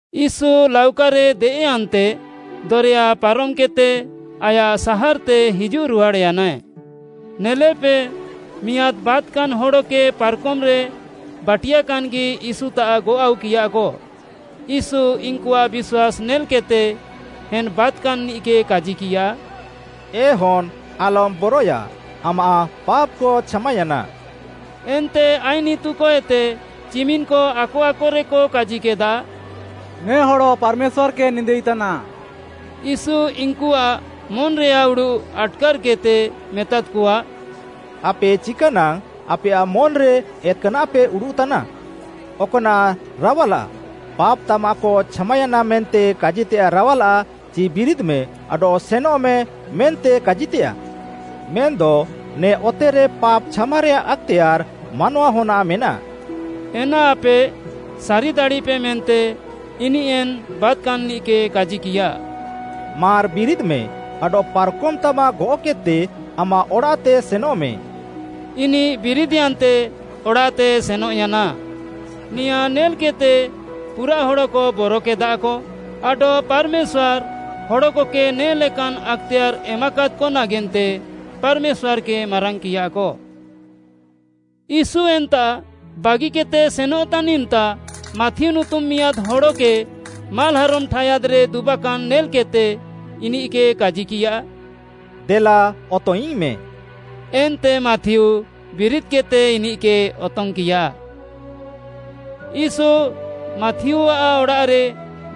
ୟୀଶୁ ଲାଉକାରେ ଦେଏଃୟାନ୍ତେ ଦରେୟା ପାରମ୍‌କେଦ୍‌ତେ ଆୟାଃ ସାହାର୍‌ତେ ହିଜୁଃରୁହାଡ଼୍‌ୟାନାଏ। ନେଲେପେ, ମିଆଁଦ୍‌ ବାତ୍‌କାନ୍‌ ହଡ଼କେ ପାର୍‌କମ୍‌ରେ ବାଟିୟାକାନ୍‌ଗି ୟୀଶୁତାଃ ଗଅଃ ଆଉକିୟାକ। ୟୀଶୁ ଇନ୍‌କୁଆଃ ବିଶ୍ୱାସ୍‌ ନେଲ୍‌କେଦ୍‌ତେ ଏନ୍‌ ବାତ୍‌କାନ୍‌ନିଃକେ କାଜିକିୟା, “ଏ ହନ୍‌ ଆଲମ୍‌ ବରଏୟା! ଆମାଃ ପାପ୍‌କ ଛାମାୟାନା।” ଏନ୍ତେ ଆଇନ୍‌ ଇତୁକଏତେ ଚିମିନ୍‌କ ଆକ ଆକରେକ କାଜିକେଦା, “ନେ ହଡ଼ ପାର୍‌ମେଶ୍ୱାର୍‌କେ ନିନ୍ଦାଇତାନା।” ୟୀଶୁ ଇନ୍‌କୁଆଃ ମନ୍‌ରେୟାଃ ଉଡ଼ୁଃ ଆଟ୍‌କାର୍‌କେଦ୍‌ତେ ମେତାଦ୍‌କଆ, “ଆପେ ଚିକାନାଙ୍ଗ୍‌ ଆପେୟାଃ ମନ୍‌ରେ ଏତ୍‌କାନାଃପେ ଉଡ଼ୁଃତାନା? ଅକ୍‌ନାଃ ରାୱାଲାଃ? ‘ପାପ୍‌ ତାମାଃକ ଛାମାୟାନା’ ମେନ୍ତେ କାଜିତେୟାଃ ରାୱାଲାଃ ଚି ‘ବିରିଦ୍‌ମେ ଆଡଃ ସେନେମେ’ ମେନ୍ତେ କାଜିତେୟାଃ? ମେନ୍‌ଦ ନେ ଅତେରେ ପାପ୍‌ ଛାମାରେୟାଃ ଆକ୍‌ତେୟାର୍‌ ମାନୱାହନ୍‌ଆଃ ମେନାଃ,” ଏନା ଆପେ ସାରିଦାଡ଼ିପେ ମେନ୍ତେ ଇନିଃ ଏନ୍‌ ବାତ୍‌କାନ୍‌ନିଃକେ କାଜିକିୟା, “ମାର୍‌ ବିରିଦ୍‌ମେ ଆଡଃ ପାର୍‌କମ୍‌ତାମାଃ ଗଅଃକେଦ୍‌ତେ ଆମାଃ ଅଡ଼ାଃତେ ସେନଃମେ।” ଇନିଃ ବିରିଦ୍‌ୟାନ୍ତେ ଅଡ଼ାଃତେ ସେନଃୟାନା। ନେଆଁଁ ନେଲ୍‌କେଦ୍‌ତେ ପୁରାଃ ହଡ଼କ ବରକେଦାକ ଆଡଃ ପାର୍‌ମେଶ୍ୱାର୍‌, ହଡ଼କକେ ନେ ଲେକାନ୍‌ ଆକ୍‌ତେୟାର୍‌ ଏମାକାଦ୍‌କ ନାଗେନ୍ତେ ପାର୍‌ମେଶ୍ୱାର୍‌କେ ମାରାଙ୍ଗ୍‌କିୟାକ। ୟୀଶୁ ଏନ୍ତାଃ ବାଗିକେଦ୍‌ତେ ସେନଃତାନ୍‌ ଇମ୍‌ତା ମାଥିଉ ନୁତୁମ୍‌ ମିଆଁଦ୍‌ ହଡ଼କେ ମାଲ୍‌ହାରମ୍‌ ଠାୟାଦ୍‌ରେ ଦୁବାକାନ୍‌ ନେଲ୍‌କେଦ୍‌ତେ ଇନିଃକେ କାଜିକିୟା, “ଦେଲା ଅତଙ୍ଗ୍‌ଇଙ୍ଗ୍‌ମେ।” ଏନ୍ତେ ମାଥିଉ ବିରିଦ୍‌କେଦ୍‌ତେ ଇନିଃକେ ଅତଙ୍ଗ୍‌କିୟା। ୟୀଶୁ, ମାଥିଉଆଃ ଅଡ଼ାଃରେ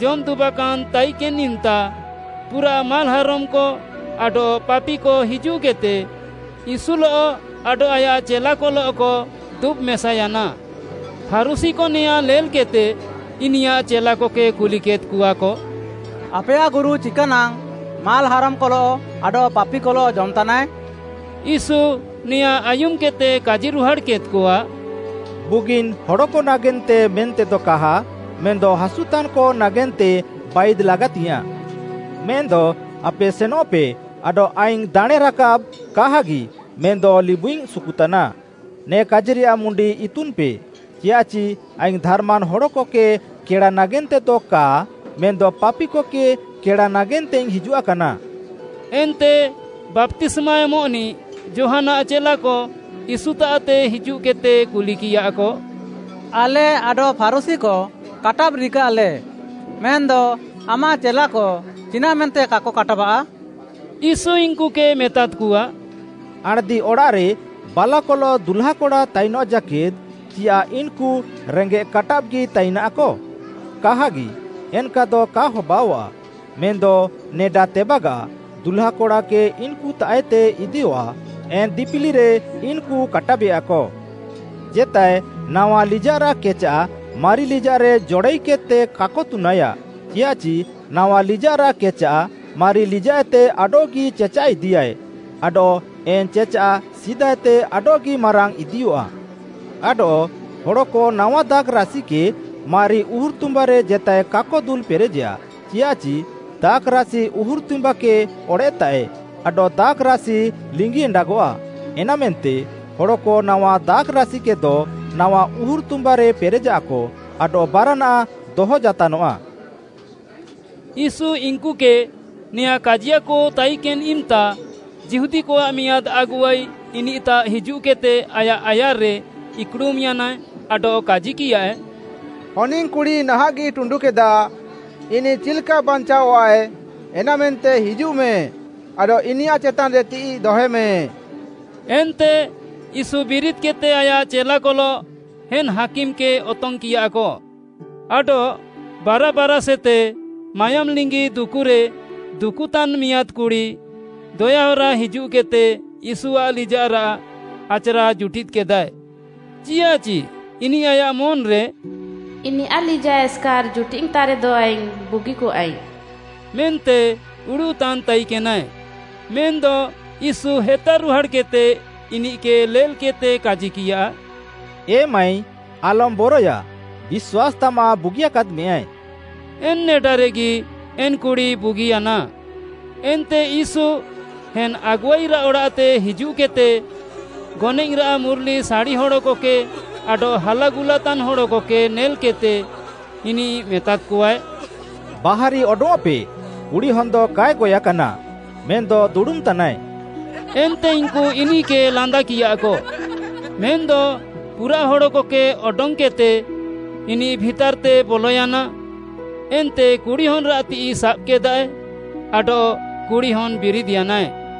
ଜମ୍‌ ଦୁବାକାନ୍‌ ତାଇକେନ୍‌ ଇମ୍‌ତା, ପୁରାଃ ମାଲ୍‌ହାରମ୍‌କ ଆଡଃ ପାପିକ ହିଜୁଃକେଦ୍‌ତେ, ୟୀଶୁଲଃ ଆଡଃ ଆୟାଃ ଚେଲାକଲଃକ ଦୁବ୍‍ ମେସାୟାନା। ଫାରୁଶୀକ ନେଆଁଁ ନେଲ୍‌କେଦ୍‌ତେ ଇନିୟାଃ ଚେଲାକକେ କୁଲିକେଦ୍‌କଆକ, “ଆପେୟାଃ ଗୁରୁ ଚିକାନାଙ୍ଗ୍‌ ମାଲ୍‌ହାରମ୍‌କଲଃ ଆଡଃ ପାପିକଲଃ ଜମ୍‌ତାନାଏ?” ୟୀଶୁ ନେଆଁଁ ଆୟୁମ୍‌କେଦ୍‌ତେ କାଜିରୁହାଡ଼୍‌କେଦ୍‌କଆ, “ବୁଗିନ୍‌ ହଡ଼କ ନାଗେନ୍ତେ ମେନ୍ତେଦ କାହା ମେନ୍‌ଦ ହାସୁତାନ୍‌କ ନାଗେନ୍ତେ ବାଇଦ୍‌ ଲାଗାତିଙ୍ଗ୍‌ୟାଁଃ। ମେନ୍‌ଦ ଆପେ ସେନଃପେ ଆଡଃ ‘ଆଇଙ୍ଗ୍‌ ଦାଣେଁରାକାବ୍‌ କାହାଗି ମେନ୍‌ଦ ଲିବୁଇଙ୍ଗ୍‌ ସୁକୁତାନା’ ନେ କାଜିରେୟାଃ ମୁଣ୍ଡି ଇତୁନ୍‌ପେ, ଚିୟାଃଚି ଆଇଙ୍ଗ୍‌ ଧାର୍‌ମାନ୍‌ ହଡ଼କକେ କେଡ଼ା ନାଗେନ୍ତେଦ କା ମେନ୍‌ଦ ପାପିକକେ କେଡ଼ା ନାଗେନ୍ତେଇଙ୍ଗ୍‌ ହିଜୁଆକାନା।” ଏନ୍ତେ ବାପ୍ତିସ୍ମା ଏମଃନିଃ ଯୋହାନ୍‌ଆଃ ଚେଲାକ ୟୀଶୁତାଃତେ ହିଜୁଃକେଦ୍‌ତେ କୁଲିକିୟାକ, “ଆଲେ ଆଡଃ ଫାରୁଶୀକ କାଟାବ୍‌ ରିକାଃଲେ, ମେନ୍‌ଦ ଆମାଃ ଚେଲାକ ଚିନାଃମେନ୍ତେ କାକ କାଟାବାଃ?” ୟୀଶୁ ଇନ୍‌କୁକେ ମେତାଦ୍‌କଆ, “ଆଣ୍‌ଦିଅଡ଼ାଃରେ ବାଲାକଲଃ ଦୁହ୍ଲାକଡ଼ା ତାଇନଃ ଜାକେଦ୍‌ ଚିୟାଃ ଇନ୍‌କୁ ରେଙ୍ଗେଃ କାଟାବ୍‌ଗି ତାଇନାଃକ? କାହାଗି, ଏନ୍‌କାଦ କା ହବାଅଆଃ। ମେନ୍‌ଦ ନେଡା ତେବାଗାଃ, ଦୁହ୍ଲାକଡ଼ାକେ ଇନ୍‌କୁତାଃଏତେ ଇଦିୟଃଆ, ଏନ୍‌ ଦିପିଲିରେ ଇନ୍‌କୁ କାଟାବେୟାକ। “ଜେତାଏ ନାୱା ଲିଜାଃରାଃ କେଚାଃ ମାରି ଲିଜାଃରେ ଜଡ଼ାଇକେଦ୍‌ତେ କାକ ତୁନାୟା, ଚିୟାଃଚି ନାୱା ଲିଜାଃରାଃ କେଚାଃ ମାରି ଲିଜାଃଏତେ ଆଡଃଗି ଚେଚାଃ ଇଦିୟାଏ, ଆଡଃ ଏନ୍‌ ଚେଚାଃ ସିଦାଏତେ ଆଡଃଗି ମାରାଙ୍ଗ୍‌ ଇଦିୟଃଆ। ଆଡଃ ହଡ଼କ ନାୱା ଦାଖ୍‌ରାସିକେ ମାରି ଉହୁର୍‌ତୁମ୍ବାରେ ଜେତାଏ କାକ ଦୁଲ୍‌ପେରେଜେୟା, ଚିୟାଃଚି ଦାଖ୍‌ରାସି ଉହୁର୍‌ତୁମ୍ବାକେ ଅଡ଼େଃତାଃଏ ଆଡଃ ଦାଖ୍‌ରାସି ଲିଙ୍ଗି ଏଣ୍ଡାଗଃଆ, ଏନାମେନ୍ତେ ହଡ଼କ ନାୱା ଦାଖ୍‌ରାସିକେଦ ନାୱା ଉହୁର୍‌ତୁମ୍ବାରେ ପେରେଜାଃକ, ଆଡଃ ବାରାନାଃ ଦହ ଜାତାନଃଆ।” ୟୀଶୁ ଇନ୍‌କୁକେ ନେଆଁଁ କାଜିୟାକ ତାଇକେନ୍‌ ଇମ୍‌ତା, ଯିହୁଦୀକଆଃ ମିଆଁଦ୍‌ ଆଗୁଆଇ ଇନିଃତାଃ ହିଜୁଃକେଦ୍‌ତେ ଆୟାଃ ଆୟାର୍‌ରେ ଇକ୍‌ଡ଼ୁମ୍‌ୟାନା ଆଡଃ କାଜିକିୟାଏ, “ହନିଙ୍ଗ୍‌କୁଡ଼ି ନାହାଁଃଗି ଟୁଣ୍ଡୁକେଦା। ଇନିଃ ଚିଲ୍‌କା ବାଞ୍ଚାଅଃଆଏ, ଏନାମେନ୍ତେ ହିଜୁଃମେ, ଆଡଃ ଇନିୟାଃ ଚେତାନ୍‌ରେ ତିଃଇ ଦହେମେ।” ଏନ୍ତେ ୟୀଶୁ ବିରିଦ୍‌କେଦ୍‌ତେ ଆୟାଃ ଚେଲାକଲଃ ଏନ୍‌ ହାକିମ୍‌କେ ଅତଙ୍ଗ୍‌କିୟାକ। ଆଡଃ ବାରା ବାରାଷ୍‌ଏତେ ମାୟୋମ୍‌ଲିଙ୍ଗି ଦୁକୁରେ ଦୁକୁତାନ୍‌ ମିଆଁଦ୍‌ କୁଡ଼ି ଦୟାହରା ହିଜୁଃକେଦ୍‌ତେ ୟୀଶୁଆଃ ଲିଜାଃରାଃ ଆଚ୍‌ରା ଜୁଟିଦ୍‌କେଦାଏ। ଚିୟାଃଚି ଇନିଃ ଆୟାଃ ମନ୍‌ରେ “ଇନିୟାଃ ଲିଜାଃ ଏସ୍‌କାର୍‌ ଜୁଟିଦ୍‌ତାରେଦ ଆଇଙ୍ଗ୍‌ ବୁଗିକଆଇଙ୍ଗ୍‌” ମେନ୍ତେ ଉଡ଼ୁଃତାନ୍‌ ତାଇକେନାଏ। ମେନ୍‌ଦ ୟୀଶୁ ହେତାରୁହାଡ଼୍‌କେଦ୍‌ତେ ଇନିଃକେ ନେଲ୍‌କିଃତେ କାଜିକିୟା, “ଏ ମାଈ, ଆଲମ୍‌ ବରଏୟା, ବିଶ୍ୱାସ୍‌ ତାମାଃ ବୁଗିୟାକାଦ୍‌ମେଁୟାଏ।” ଏନ୍‌ ନେଡାରେଗି ଏନ୍‌ କୁଡ଼ି ବୁଗିୟାନା। ଏନ୍ତେ ୟୀଶୁ ଏନ୍‌ ଆଗୁଆଇରାଃ ଅଡ଼ାଃତେ ହିଜୁଃକେଦ୍‌ତେ ଗନଏଃରାଃ ମୁର୍‌ଲିସାଡ଼ି ହଡ଼କକେ ଆଡଃ ହାଲାଗୁଲାତାନ୍‌ ହଡ଼କକେ ନେଲ୍‌କେଦ୍‌ତେ, ଇନିଃ ମେତାଦ୍‌କଆଏ, “ବାହାରି ଅଡଙ୍ଗ୍‌ଅଃପେ କୁଡ଼ିହନ୍‌ଦ କାଏ ଗଏଃକାନା, ମେନ୍‌ଦ ଦୁଡ଼ୁମ୍‌ତାନାଏ।” ଏନ୍ତେ ଇନ୍‌କୁ ଇନିଃକେ ଲାନ୍ଦାକିୟାକ। ମେନ୍‌ଦ ପୁରାଃ ହଡ଼କକେ ଅଡଙ୍ଗ୍‌କେଦ୍‌ତେ, ଇନିଃ ଭିତାର୍‌ତେ ବଲୟାନା ଏନ୍ତେ କୁଡ଼ି ହନ୍‌ରାଃ ତିଃଇ ସାବ୍‌କେଦାଏ, ଆଡଃ କୁଡ଼ି ହନ୍‌ ବିରିଦ୍‌ୟାନାଏ।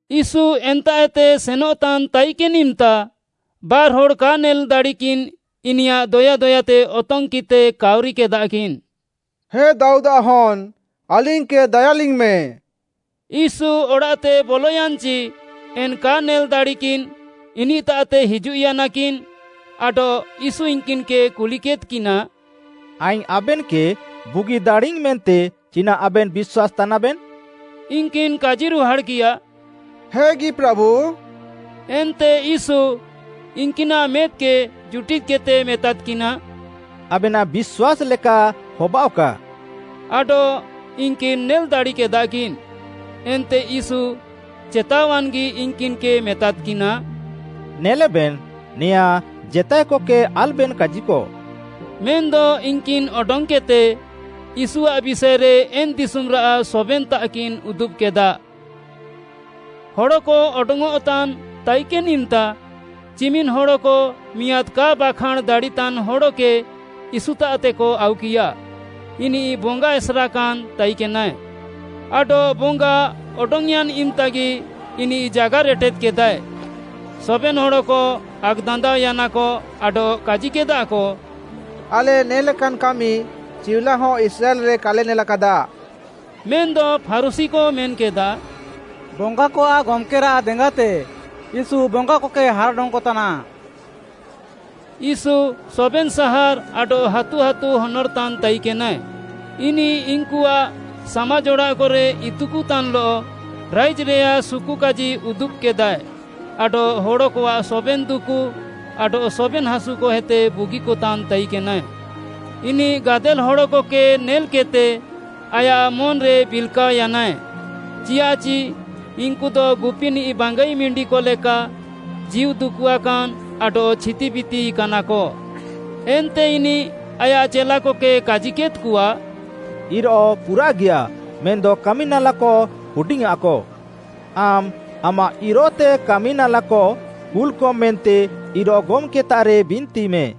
ୟୀଶୁ ଏନ୍ତାଃଏତେ ସେନଃତାନ୍‌ ତାଇକେନ୍‌ ଇମ୍‌ତା ବାର୍‌ହଡ଼୍‌ କା ନେଲ୍‌ଦାଡ଼ିକିନ୍‌ ଇନିୟାଃ ଦୟାଦୟାତେ ଅତଙ୍ଗ୍‌କିଃତେ କାଉରିକେଦାକିନ୍‌, “ହେ ଦାଉଦ୍‌ଆଃ ହନ୍‌, ଆଲିଙ୍ଗ୍‌କେ ଦାୟାଲିଙ୍ଗ୍‌ମେ।” ୟୀଶୁ ଅଡ଼ାଃତେ ବଲୟାନ୍‌ଚି, ଏନ୍‌ କା ନେଲ୍‌ଦାଡ଼ିକିନ୍‌ ଇନିଃତାଃତେ ହିଜୁଃୟାନାକିନ୍‌ ଆଡଃ ୟୀଶୁ ଇନ୍‌କିନ୍‌କେ କୁଲିକେଦ୍‌କିନା, “ଆଇଙ୍ଗ୍‌ ଆବେନ୍‌କେ ବୁଗି ଦାଡ଼ିୟାଇଙ୍ଗ୍‌ ମେନ୍ତେ ଚିନାଃ ଆବେନ୍‌ ବିଶ୍ୱାସ୍‌ତାନାବେନ୍‌?” ଇନ୍‌କିନ୍‌ କାଜିରୁହାଡ଼୍‌କିୟା, “ହେଗି, ପ୍ରାଭୁ।” ଏନ୍ତେ ୟୀଶୁ ଇନ୍‌କିନାଃ ମେଦ୍‌କେ ଜୁଟିଦ୍‌କେଦ୍‌ତେ ମେତାଦ୍‌କିନା, “ଆବେନାଃ ବିଶ୍ୱାସ୍‌ ଲେକା ହବାଅଃକା।” ଆଡଃ ଇନ୍‌କିନ୍‌ ନେଲ୍‌ ଦାଡ଼ିକେଦାକିନ୍‌। ଏନ୍ତେ ୟୀଶୁ ଚେତାୱାନ୍‌ଗି ଇନ୍‌କିନ୍‌କେ ମେତାଦ୍‌କିନା, “ନେଲେବେନ୍‌, ନେଆଁଁ ଜେତାଏକକେ ଆଲ୍‌ବେନ୍‌ କାଜିକ।” ମେନ୍‌ଦ ଇନ୍‌କିନ୍‌ ଅଡଙ୍ଗ୍‌କେଦ୍‌ତେ, ୟୀଶୁଆଃ ବିଷାଏରେ ଏନ୍‌ ଦିଶୁମ୍‌ରାଃ ସବେନ୍‌ତାଃକିନ୍‌ ଉଦୁବ୍‌କେଦା। ହଡ଼କ ଅଡଙ୍ଗ୍‌ଅଃତାନ୍‌ ତାଇକେନ୍‌ ଇମ୍‌ତା, ଚିମିନ୍‌ ହଡ଼କ ମିଆଁଦ୍‌ କା ବାଖାଁଣ୍‌ ଦାଡ଼ିତାନ୍‌ ହଡ଼କେ ୟୀଶୁତାଃତେକ ଆଉକିୟା। ଇନିଃ ବଙ୍ଗା ଏସେର୍‌କାନ୍‌ ତାଇକେନାଏ। ଆଡଃ ବଙ୍ଗା ଅଡଙ୍ଗ୍‌ୟାନ୍‌ ଇମ୍‌ତାଗି ଇନିଃ ଜାଗାର୍‌ ଏଟେଦ୍‌କେଦାଏ। ସବେନ୍‌ ହଡ଼କ ଆକ୍‌ଦାନ୍ଦାଅୟାନାକ ଆଡଃ କାଜିକେଦାଃକ, “ଆଲେ ନେ ଲେକାନ୍‌ କାମି ଚିଉଲାହ ଇସ୍ରାଏଲ୍‌ରେ କାଲେ ନେଲାକାଦା।” ମେନ୍‌ଦ ଫାରୁଶୀକ ମେନ୍‌କେଦା, “ବଙ୍ଗାକଆଃ ଗମ୍‌କେରାଃ ଦେଙ୍ଗାତେ ୟୀଶୁ ବଙ୍ଗାକକେ ହାର୍‌ ଅଡଙ୍ଗ୍‌କତାନା।” ୟୀଶୁ ସବେନ୍‌ ସାହାର୍‌ ଆଡଃ ହାତୁ ହାତୁ ହନର୍‌ତାନ୍‌ ତାଇକେନାଏ। ଇନିଃ ଇନ୍‌କୁଆଃ ସାମାଜ୍‌ ଅଡ଼ାଃକରେ ଇତୁକତାନ୍‌ଲଃ ରାଇଜ୍‌ରେୟାଃ ସୁକୁକାଜି ଉଦୁବ୍‍କେଦାଏ ଆଡଃ ହଡ଼କଆଃ ସବେନ୍‌ ଦୁକୁ ଆଡଃ ସବେନ୍‌ ହାସୁକଏତେ ବୁଗିକତାନ୍‌ ତାଇକେନାଏ। ଇନିଃ ଗାଦେଲ୍‌ ହଡ଼କକେ ନେଲ୍‌କେଦ୍‌ତେ ଆୟାଃ ମନ୍‌ରେ ବିଲ୍‌କାଅୟାନାଏ, ଚିୟାଃଚି ଇନ୍‌କୁଦ ଗୁପିନିଃ ବାଙ୍ଗାଇ ମିଣ୍ଡିକ ଲେକା ଜୀଉ ଦୁକୁଆକାନ୍‌ ଆଡଃ ଛିତିବିତିକାନାକ। ଏନ୍ତେ ଇନିଃ ଆୟାଃ ଚେଲାକକେ କାଜିକେଦ୍‌କଆ, “ଇରୋଃ ପୁରାଃଗିୟାଃ ମେନ୍‌ଦ କାମିନାଲାକ ହୁଡିଙ୍ଗ୍‌ଆଁକ। ଆମ୍‌ ଆମାଃ ଇରୋଃତେ କାମି ନାଲାକ କୁଲ୍‌କମ୍ ମେନ୍ତେ ଇରୋଃ ଗମ୍‌କେତାଃରେ ବିନ୍ତିମେ।”